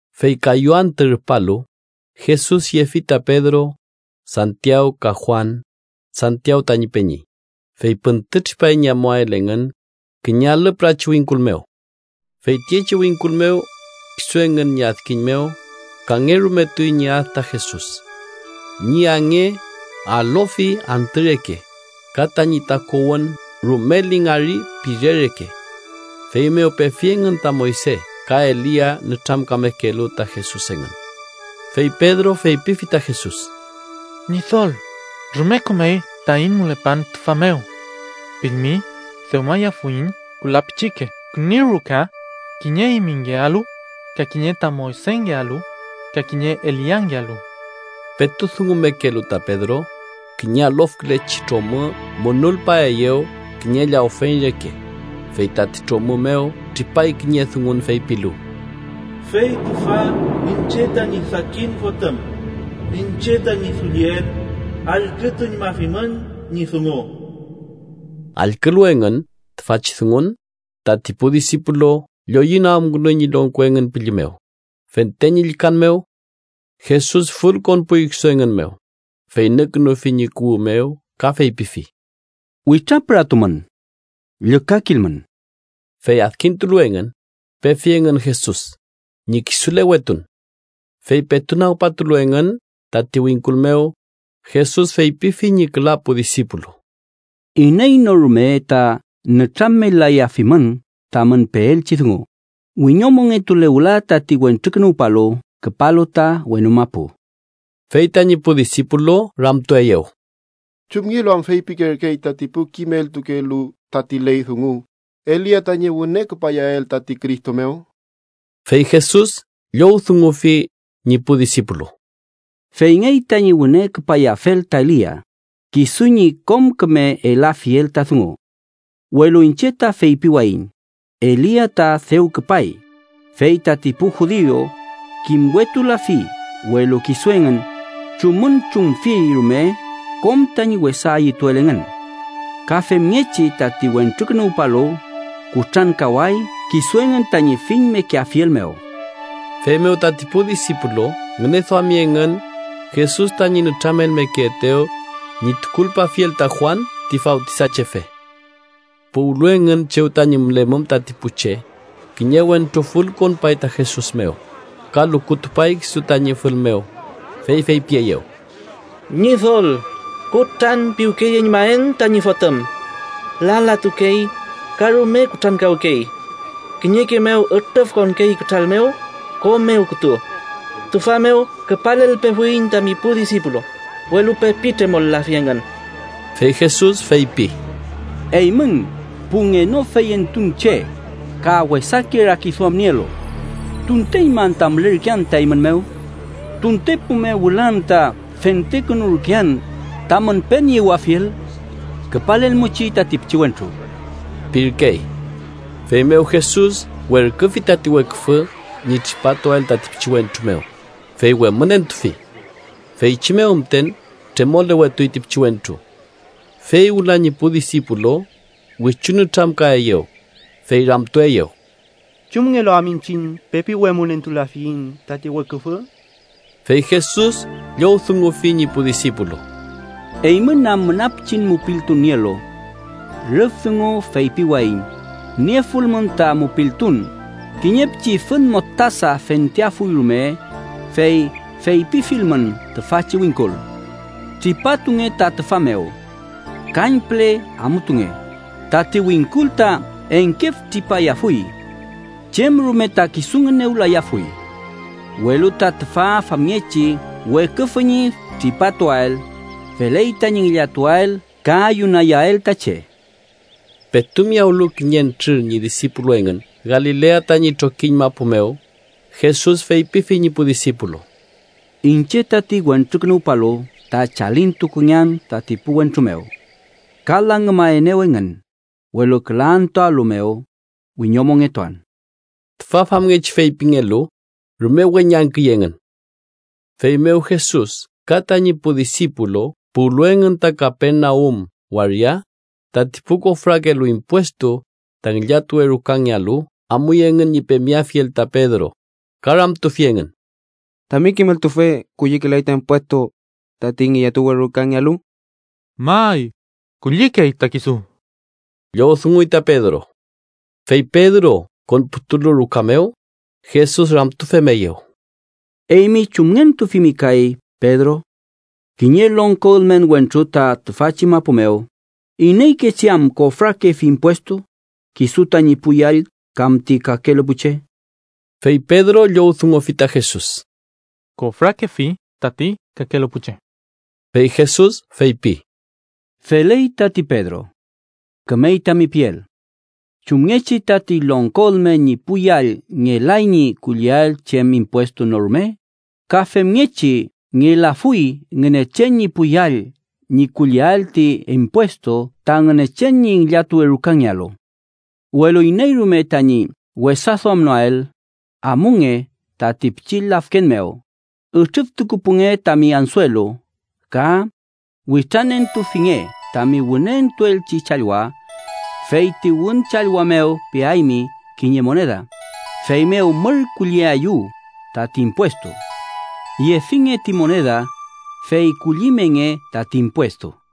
Fey kayu antü rupalu, Jesus yefi ta Pedro, Santiaw ka Juan (Santiaw tañi peñi), fey püntütripay ñi amuael engün kiñe alü pürachi wingkul mew. Fey tiyechi wingkul mew, kisu engün ñi adkiñ mew, kangerumetuy ñi ad ta Jesus. Ñi ange alofi antü reke, ka tañi takuwün rume lingari pire reke. Feymew pefi engün ta Moyse ka Elia nütramkamekelu ta Jesus engün. Fey Pedro feypifi ta Jesus: —Ñidol, ¡rume kümey taiñ mülepan tüfa mew! Pilmi, dewmayafuiñ küla pichike küni ruka: kiñe eymingealu, ka kiñe ta Moysengealu ka kiñe Eliangealu. Petu dungumekelu ta Pedro, kiñe alofkülechi tromü munulpaeyew kiñe llawfeñ reke, fey tati tromü mew tripay kiñe dungun feypilu: “Fey tüfa iñche tañi sakin Fotüm, iñche tañi dulliel. Allkütuñmafimün ñi dungu.” Allkülu engün tüfachi dungun, tati pu disipulu lloyünagümkünuy ñi longko engün pülli mew, fente ñi llükan mew. Jesus fülkonpuy kisu engün mew, fey nükünufi ñi kuwü mew ka feypifi: —Witrapüratumün. Llükakilmün. Fey adkintulu engün, pefi engün Jesus ñi kisulewetun. Fey petu nagpatulu engün tati wingkul mew, Jesus feypifi ñi küla pu disipulu: —Iney no rume ta nütramel-layafimün tamün peelchi dungu, wiñomongetule wüla tati Wentrukünuwpalu küpalu ta wenu mapu. Fey tañi pu disipulu ramtueyew: —¿Chumngelu am feypikerkey tati pu kimeltukelu tati ley dungu Elia tañi wüne küpayael tati Cristo mew? Fey Jesus llowdungufi ñi pu disipulu: —Feyngey tañi wüne küpayafel ta Elia, kisu ñi kom küme elafiel ta dungu. Welu iñche ta feypiwayiñ, Elia ta dew küpay, fey tati pu judiu kimwetulafi, welu kisu engün chumünchumfi rume kom tañi wesa ayütuel engün. Ka femngechi, tati Wentrukünuwpalu kutrankaway kisu engün tañi fillmekeafiel mew. Feymew tati pu disipulu ngüneduami engün Jesus tañi nütramelmekeetew ñi tukulpafiel ta Juan ti Fawtisachefe. Puwlu engün chew tañi mülemum tati pu che, kiñe wentru fülkonpay ta Jesus mew, ka lukutupay kisu tañi fül mew, fey feypieyew: —Ñidol, kutranpiwkeyeñmaen tañi fotüm. Lalatukey ka rume kutrankawkey. Kiñeke mew ütrüfkonkey kütral mew, ko mew kütu. Tüfa mew küpalelpefuiñ tami pu disipulu, welu pepi tremolafi engün. Fey Jesus feypi: —¡Eymün pu ngenofeyentun che ka wesake rakiduam nielu! ¿Tunteñma anta mülerkean ta eymün mew? ¿Tuntepu mew wüla anta fentekünurkean tamün peniewafiel? Küpalelmuchi tati pichiwentru ―pirkey. Feymew Jesus werküfi tati weküfü ñi tripatuael tati pichiwentru mew, fey wemünentufi. Feychi mew müten tremolewetuy ti pichiwentru. Fey wüla ñi pu disipulu wichu nütramkaeyew, fey ramtueyew: —¿Chumngelu am iñchiñ pepi wemünentulafiyiñ tati weküfü? Fey Jesus llowdungufi ñi pu disipulu: —Eymün am müna pichin mupiltun nielu. Rüf dungu feypiwayiñ niefulmün ta mupiltun, kiñe pichi fün mostasa fenteafuy rume, fey feypifilmün tüfachi wingkul: ‘Tripatunge ta tüfa mew. Kañpüle amutunge’, tati wingkul ta engkef tripayafuy. Chem rume ta kisu ngünewlayafuy. Welu ta tüfa famngechi weküfü ñi tripatuael, feley tañi ngillatuael ka ayunayael ta che. Petu miyawlu kiñentrür ñi disipulu engün Galilea tañi trokiñ mapu mew, Jesus feypifi ñi pu disipulu: —Iñche tati Wentrukünuwpalu ta chalintukungean tati pu wentru mew. Ka langümaenew engün, welu küla antüalu mew, wiñomongetuan. Tüfa famngechi feypingelu, rume weñangküy engün. Feymew Jesus ka tañi pu disipulu puwlu engün ta Kapernaum waria, tati pu kofrakelu impuestu ta ngillatuwe rukangealu amuy engün ñi pemeafiel ta Pedro, ka ramtufi engün: —¿Tami kimeltufe kullikelay ta impuestu tati ngillatuwe rukangealu? —May, kullikey ta kisu ―llowdunguy ta Pedro. Fey Pedro konputulu ruka mew, Jesus ramtufemeyew: —¿Eymi chumngentufimi kay, Pedro? Kiñe longko ülmen wentru ta tüfachi mapu mew, ¿ineykechi am kofrakefi impuestu: kisu tañi pu yall kam ti kakelu pu che? Fey Pedro llowdungufi ta Jesus: —Kofrakefi tati kakelu pu che. Fey Jesus feypi: —Feley tati, Pedro. Kümey tami piel. Chumngechi tati longko ülmen ñi pu yall ngelay ñi kulliael chem impuestu no rume, ka femngechi ngelafuy Ngünechen ñi pu yall ñi kulliael ti impuestu ta Ngünechen ñi ngillatuwe rukangealu. Welu iney rume tañi wesaduamnoael, amunge tati pichi lafken mew, ütrüftukupunge tami ansuelu ka witranentufinge tami wüne entuelchi challwa. Fey ti wün challwa mew peaymi kiñe moneda, feymew mür kulliayu tati impuestu. Yefinge ti moneda, fey kullimenge tati impuestu.